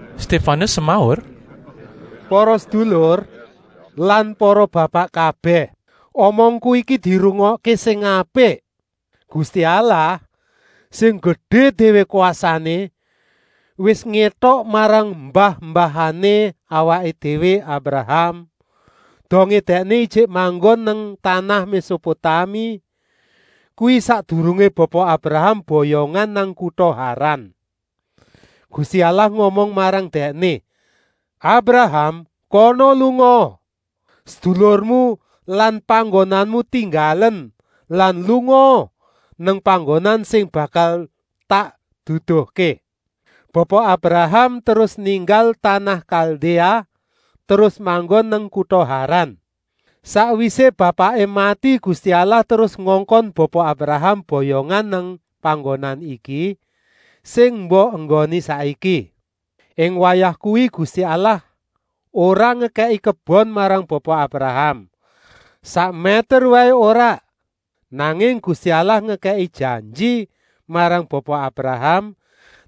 Stéfanus semaur: “Para sedulur lan para bapak kabèh. Omongku iki dirungokké sing apik. Gusti Allah, sing gedé déwé kwasané, wis ngétok marang mbah-mbahané awaké déwé Abraham, dongé dèkné ijik manggon nang tanah Mésopotami. Kuwi sakdurungé Bapa Abraham boyongan nang kuta Haran. Gusti Allah ngomong marang dèkné: ‘Abraham, kana lungaa, sedulurmu lan panggonanmu tinggalen lan lungaa nang panggonan sing bakal tak duduhké!’ Bapa Abraham terus ninggal tanah Kaldéa terus manggon nang kuta Haran. Sakwisé bapaké mati Gusti Allah terus ngongkon Bapa Abraham boyongan nang panggonan iki, sing mbok enggoni saiki. Ing wayah kuwi Gusti Allah ora ngekèki kebon marang Bapa Abraham, sak mèter waé ora. Nanging Gusti Allah ngekèki janji marang Bapa Abraham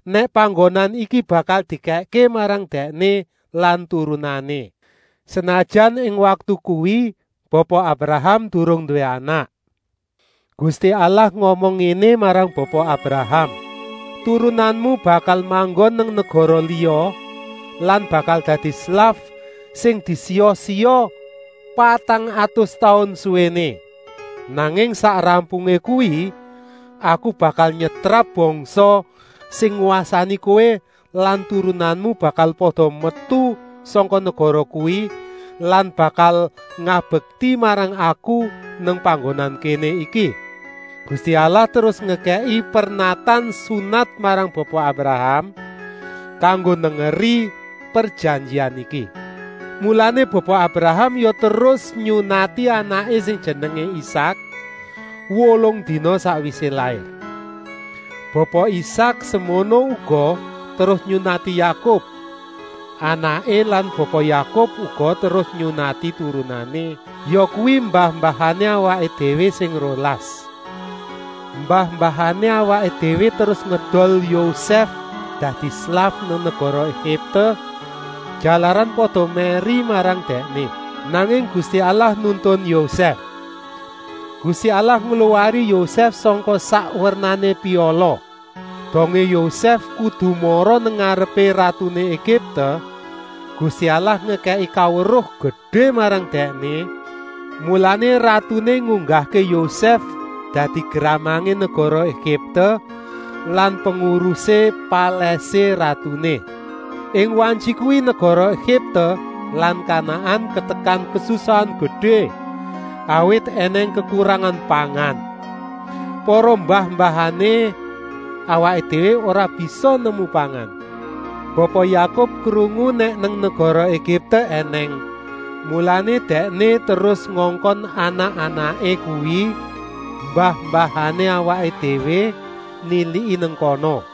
nèk panggonan iki bakal dikèkké marang dèkné lan turunané, senajan ing waktu kuwi Bapa Abraham durung nduwé anak. Gusti Allah ngomong ngéné marang Bapa Abraham: ‘Turunanmu bakal manggon nang negara liya lan bakal dadi slaf sing disiya-siya patang atus taun suwéné. Nanging sak rampungé kuwi Aku bakal nyetrap bangsa sing ngwasani kowé lan turunanmu bakal pada metu sangka negara kuwi lan bakal ngabekti marang Aku nang panggonan kéné iki.’ Gusti Allah terus ngekèki pernatan sunat marang Bapa Abraham, kanggo nengeri prejanjian iki. Mulané Bapa Abraham ya terus nyunati anaké sing jenengé Isak, wolung dina sakwisé lair. Bapa Isak semono uga terus nyunati Yakub, anaké lan Bapa Yakub uga terus nyunati turunané, yakuwi mbah-mbahané awaké déwé sing rolas. “Mbah-mbahané awaké déwé terus ngedol Yosèf dadi slaf nang negara Egipte, jalaran pada mèri marang dèkné. Nanging Gusti Allah nuntun Yosèf. Gusti Allah ngluwari Yosèf sangka sak wernané piala. Dongé Yosèf kudu mara nang ngarepé ratuné Egipte, Gusti Allah ngekèki kaweruh gedé marang dèkné, mulané ratuné ngunggahké Yosèf dadi gramangé negara Egipte lan pengurusé palèsé ratuné. Ing wayah kuwi negara Egipte lan Kanaan katekan kasusahan gedé, awit ènèng kekurangan pangan. Para mbah-mbahané awaké déwé ora bisa nemu pangan. Bapa Yakub krungu nèk nang negara Egipte ènèng, mulané dèkné terus ngongkon anak-anaké, kuwi mbah-mbahané awaké déwé, niliki nang kana.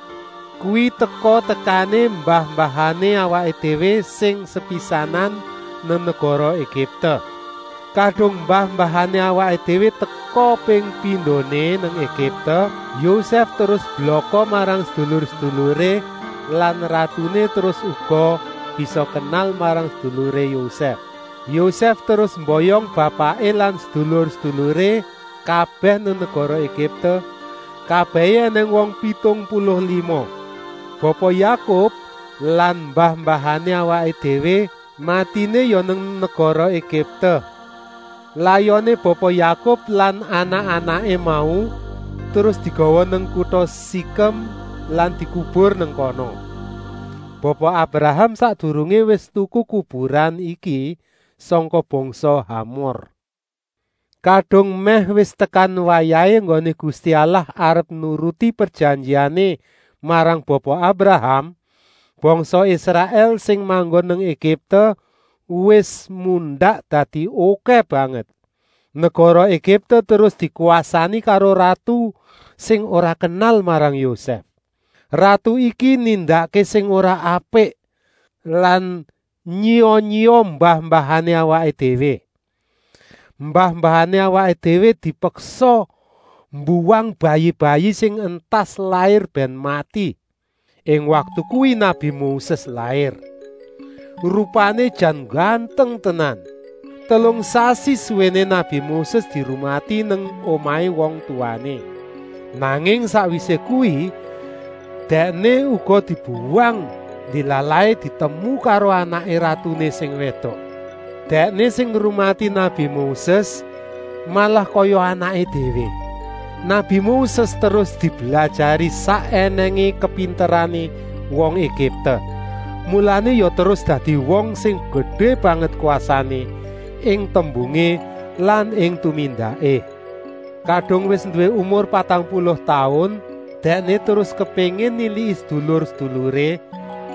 Kuwi teka-tekané mbah-mbahané awaké déwé sing sepisanan nang negara Egipte. Kadung mbah-mbahané awaké déwé teka ping pindoné nang Egipte, Yosèf terus blaka marang sedulur-seduluré lan ratuné terus uga bisa kenal marang seduluré Yosèf. Yosèf terus mboyong bapaké lan sedulur-seduluré kabèh nang negara Egipte. Kabèhé ènèng wong pitung puluh lima. Bapa Yakub lan mbah-mbahané awaké déwé matiné ya nang negara Egipte. Layoné Bapa Yakub lan anak-anaké mau terus digawa nang kuta Sikem lan dikubur nang kono. Bapa Abraham sakdurungé wis tuku kuburan iki sangka bangsa Hamor. “Kadung mèh wis tekan wayahé enggoné Gusti Allah arep nuruti prejanjiané marang Bapa Abraham, bangsa Israèl sing manggon nang Egipte wis mundak dadi okèh banget. Negara Egipte terus dikwasani karo ratu sing ora kenal marang Yosèf. Ratu iki nindakké sing ora apik lan nyiya-nyiya mbah-mbahané awaké déwé. Mbah-mbahané awaké déwé dipeksa mbuwang bayi-bayi sing entas lair bèn mati. Ing waktu kuwi nabi Moses lair. Rupané jan ngganteng tenan. Telung sasi suwéné nabi Moses dirumati nang omahé wong tuwané. Nanging sakwisé kuwi dèkné uga dibuwang. Ndilalahé ditemu karo anaké ratuné sing wédok. Dèkné sing ngrumati nabi Moses, malah kaya anaké déwé waé. Nabi Moses terus diblajari sak ènèngé kapinterané wong Egipte, mulané ya terus dadi wong sing gedé banget kwasané, ing tembungé lan ing tumindaké. “Kadung wis nduwé umur patang puluh taun dèkné terus kepéngin niliki sedulur-seduluré,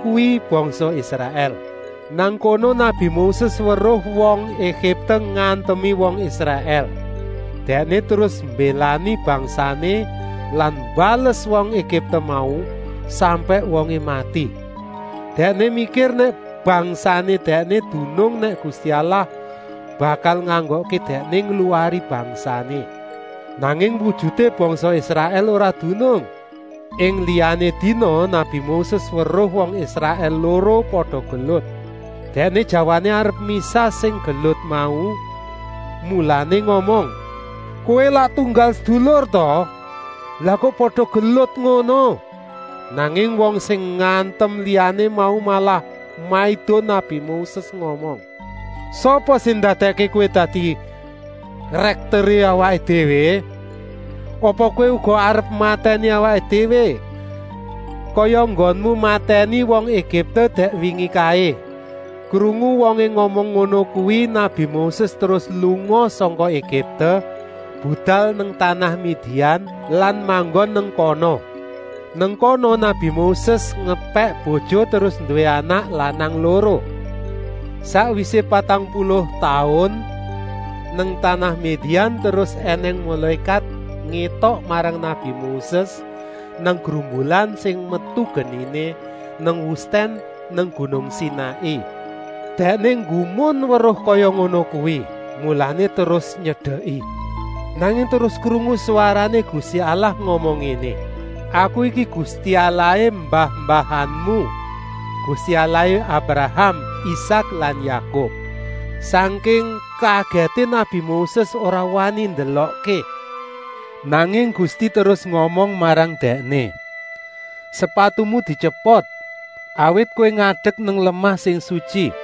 kuwi bangsa Israèl. Nang kono nabi Moses weruh wong Egipte ngantemi wong Israèl. Dèkné terus mbélani bangsané lan mbales wong Egipte mau, sampèk wongé mati. Dèkné mikir nèk bangsané dèkné dunung nèk Gusti Allah bakal nganggokké dèkné ngluwari bangsané. Nanging wujuté bangsa Israèl ora dunung. Ing liyané dina nabi Moses weruh wong Israèl loro pada gelut. Dèkné jawané arep misah sing gelut mau, mulané ngomong: ‘Kowé lak tunggal sedulur ta? Lah kok pada gelut ngono?’ Nanging wong sing ngantem liyané mau malah maido nabi Moses ngomong: ‘Sapa sing ndadèkké kowé dadi rèkteré awaké déwé? Apa kowé uga arep matèni awaké déwé kaya enggonmu matèni wong Egipte dèk wingi kaé?’ Krungu wongé ngomong ngono kuwi nabi Moses terus lunga sangka Egipte, budal nang tanah Midian lan manggon nang kono. Nang kono nabi Moses ngepèk bojo terus nduwé anak lanang loro. “Sakwisé patang puluh taun nang tanah Midian terus ènèng mulékat ngétok marang nabi Moses nang grumbulan sing metu geniné, nang wustèn nang gunung Sinai. Dèkné nggumun weruh kaya ngono kuwi, mulané terus nyedeki. Nanging terus krungu swarané Gusti Allah ngomong ngéné: ‘Aku iki Gusti Allahé mbah-mbahanmu, Gusti Allahé Abraham, Isak lan Yakub.’ Sangking kagèté nabi Moses ora wani ndelokké. Nanging Gusti terus ngomong marang dèkné: ‘Sepatumu dityepot, awit kowé ngadek nang lemah sing sutyi.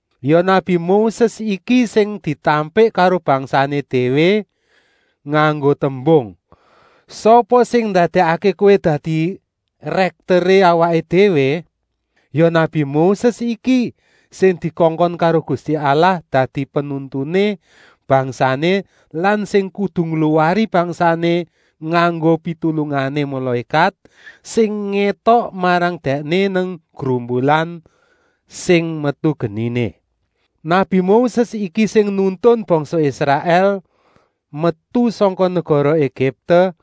“Ya nabi Moses iki sing ditampik karo bangsané déwé nganggo tembung: ‘Sapa sing ndadèkké kowé dadi rèkteré awaké déwé?’ Ya nabi Moses iki sing dikongkon karo Gusti Allah dadi penuntuné bangsané lan sing kudu ngluwari bangsané nganggo pitulungané mulékat, sing ngétok marang dèkné nang grumbulan sing metu geniné. Nabi Moses iki sing nuntun bangsa Israèl metu sangka negara Egipte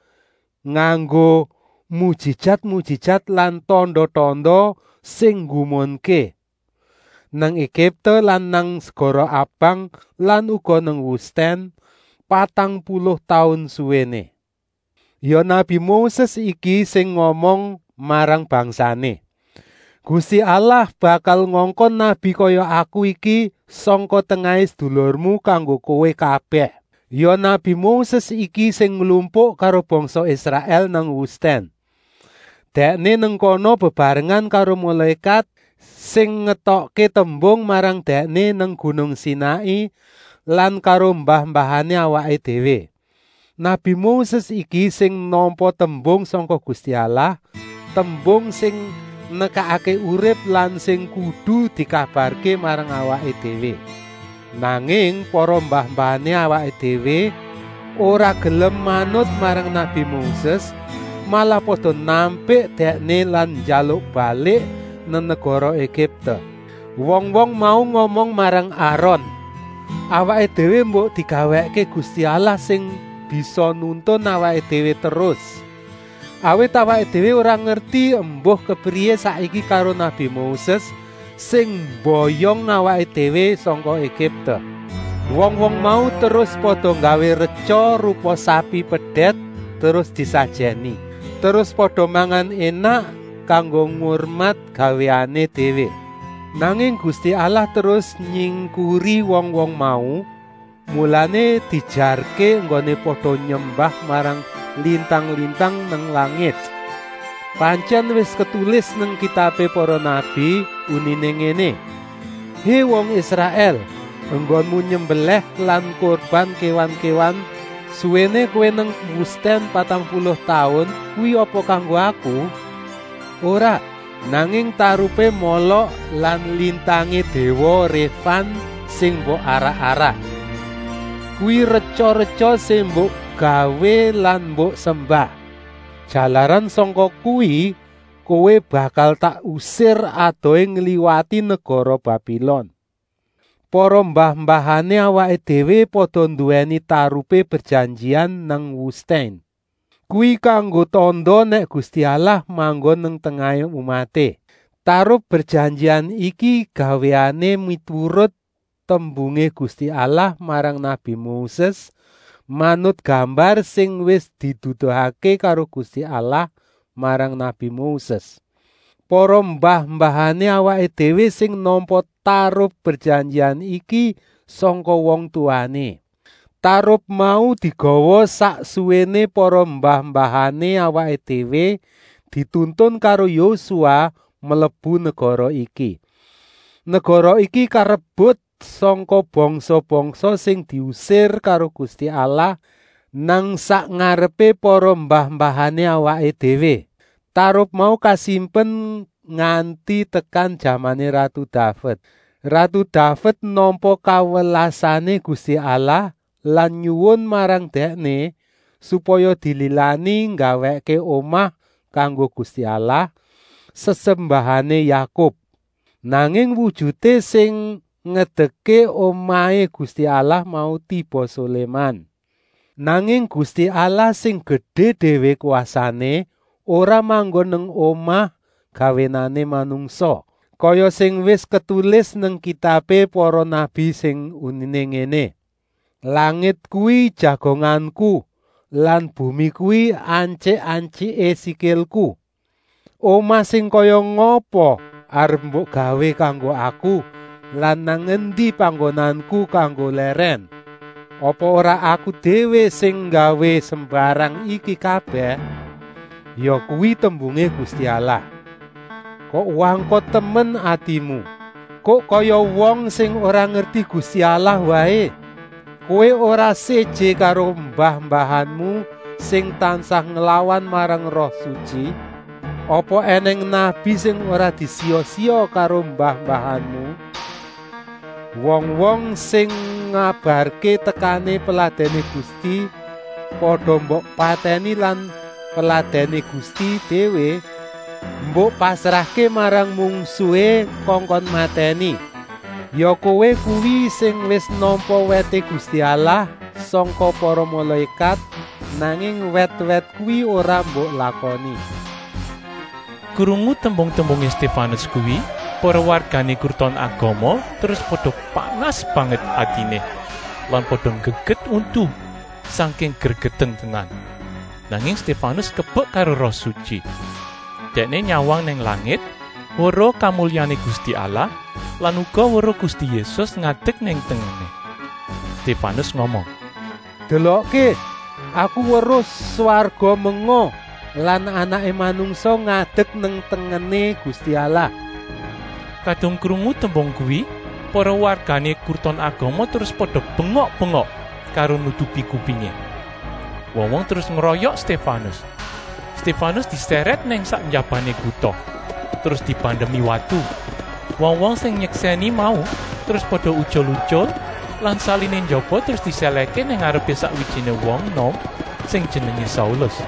nganggo mujijat-mujijat lan tanda-tanda sing nggumunké, nang Egipte lan nang segara Abang lan uga nang wustèn, patang puluh taun suwéné. Ya nabi Moses iki sing ngomong marang bangsané: ‘Gusti Allah bakal ngongkon nabi kaya aku iki sangka tengahé sedulurmu kanggo kowé kabèh!’ Ya nabi Moses iki sing nglumpuk karo bangsa Israèl nang wustèn. Dèkné nang kono bebarengan karo mulékat sing ngetokké tembung marang dèkné nang gunung Sinai lan karo mbah-mbahané awaké déwé. Nabi Moses iki sing nampa tembung sangka Gusti Allah, tembung sing nekakké urip lan sing kudu dikabarké marang awaké déwé. “Nanging para mbah-mbahané awaké déwé ora gelem manut marang nabi Moses, malah pada nampik dèkné lan njaluk balik nang negara Egipte. Wong-wong mau ngomong marang Aron: ‘Awaké déwé mbok digawèkké gusti allah sing bisa nuntun awaké déwé terus. Awit awaké déwé ora ngerti embuh kepriyé saiki karo nabi Moses, sing mboyong awaké déwé sangka Egipte.’ Wong-wong mau terus pada nggawé retya rupa sapi pedèt terus disajèni. Terus pada mangan énak kanggo ngurmat gawéané déwé. Nanging Gusti Allah terus nyingkuri wong-wong mau, mulané diejarké enggoné pada nyembah marang lintang-lintang nang langit. Pantyèn wis ketulis nang kitabé para nabi, uniné ngéné: ‘Hé wong Israèl! Enggonmu nyembelèh lan kurban kéwan-kéwan suwéné kowé nang wustèn patang puluh taun kuwi apa kanggo Aku? Ora! Nanging tarupé Molok lan lintangé déwa Réfan sing mbok arak-arak. Kuwi retya-retya sing mbok gawé lan mbok sembah. Jalaran sangka kuwi kowé bakal tak usir adohé ngliwati negara Babilon.’ “Para mbah-mbahané awaké déwé pada nduwèni tarupé prejanjian nang wustèn. (Kuwi kanggo tanda nèk Gusti Allah manggon nang tengahé umaté). Tarup prejanjian iki gawéané miturut tembungé Gusti Allah marang nabi Moses, manut gambar sing wis diduduhké karo Gusti Allah marang nabi Moses. Para mbah-mbahané awaké déwé sing nampa tarup prejanjian iki sangka wong tuwané. Tarup mau digawa sak suwéné para mbah-mbahané awaké déwé dituntun karo Yosua mlebu negara iki. Negara iki karebut sangka bangsa-bangsa sing diusir karo Gusti Allah nang sak ngarepé para mbah-mbahané awaké déwé. Tarup mau kasimpen nganti tekan jamané ratu Daved. Ratu Daved nampa kawelasané Gusti Allah lan nyuwun marang Dèkné, supaya dililani nggawèkké omah kanggo Gusti Allah, sesembahané Yakub. Nanging wujuté sing ngedekké omahé Gusti Allah mau tiba Soléman. “Nanging Gusti Allah sing gedé déwé kwasané ora manggon nang omah gawéané manungsa, kaya sing wis ketulis nang kitabé para nabi sing uniné ngéné: ‘Langit kuwi jagonganku lan bumi kuwi antyik-antyiké sikilku. Omah sing kaya ngapa arep mbok gawé kanggo aku lan nang endi panggonanku kanggo lèrèn. Apa ora Aku déwé sing nggawé sembarang iki kabèh? Yakuwi tembungé Gusti Allah!’ “Kok wangkot temen atimu! Kok kaya wong sing ora ngerti Gusti Allah waé! Kowé ora séjé karo mbah-mbahanmu sing tansah nglawan marang Roh Sutyi! Apa ènèng nabi sing ora disiya-siya karo mbah-mbahanmu? Wong-wong sing ngabarké tekané Peladèné Gusti pada mbok patèni lan Peladèné Gusti déwé mbok pasrahké marang mungsuhé kongkon matèni. Ya kowé kuwi sing wis nampa wèté Gusti Allah sangka para mulékat, nanging wèt-wèt kuwi ora mbok lakoni.” Krungu tembung-tembungé Stéfanus kuwi para wargané Kruton Agama terus pada panas banget atiné lan pada nggeget untu sangking gregeten tenan. Nanging Stéfanus kebek karo Roh Sutyi. Dèkné nyawang nang langit weruh kamulyané Gusti Allah lan uga weruh Gusti Yésus ngadek nang tengené. Stéfanus ngomong: “Delokké, aku weruh swarga menga lan Anaké Manungsa ngadek nang tengené Gusti Allah.” Kadung krungu tembung kuwi para wargané Kruton Agama terus pada bengok-bengok karo nutupi kupingé. Wong-wong terus ngroyok Stéfanus. Stéfanus disèrèt nang sak njabané kuta, terus dibandemi watu. Wong-wong sing nyeksèni mau terus pada utyul-utyul lan saliné njaba terus disèlèhké nang ngarepé sakwijiné wong enom sing jenengé Saulus.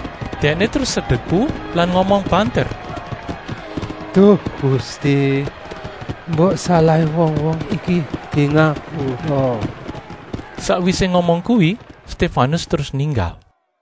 Dèkné terus sedeku lan ngomong banter: “Duh Gusti, mbok salahé wong-wong iki dingapura!” Sakwisé ngomong kuwi Stéfanus terus ninggal.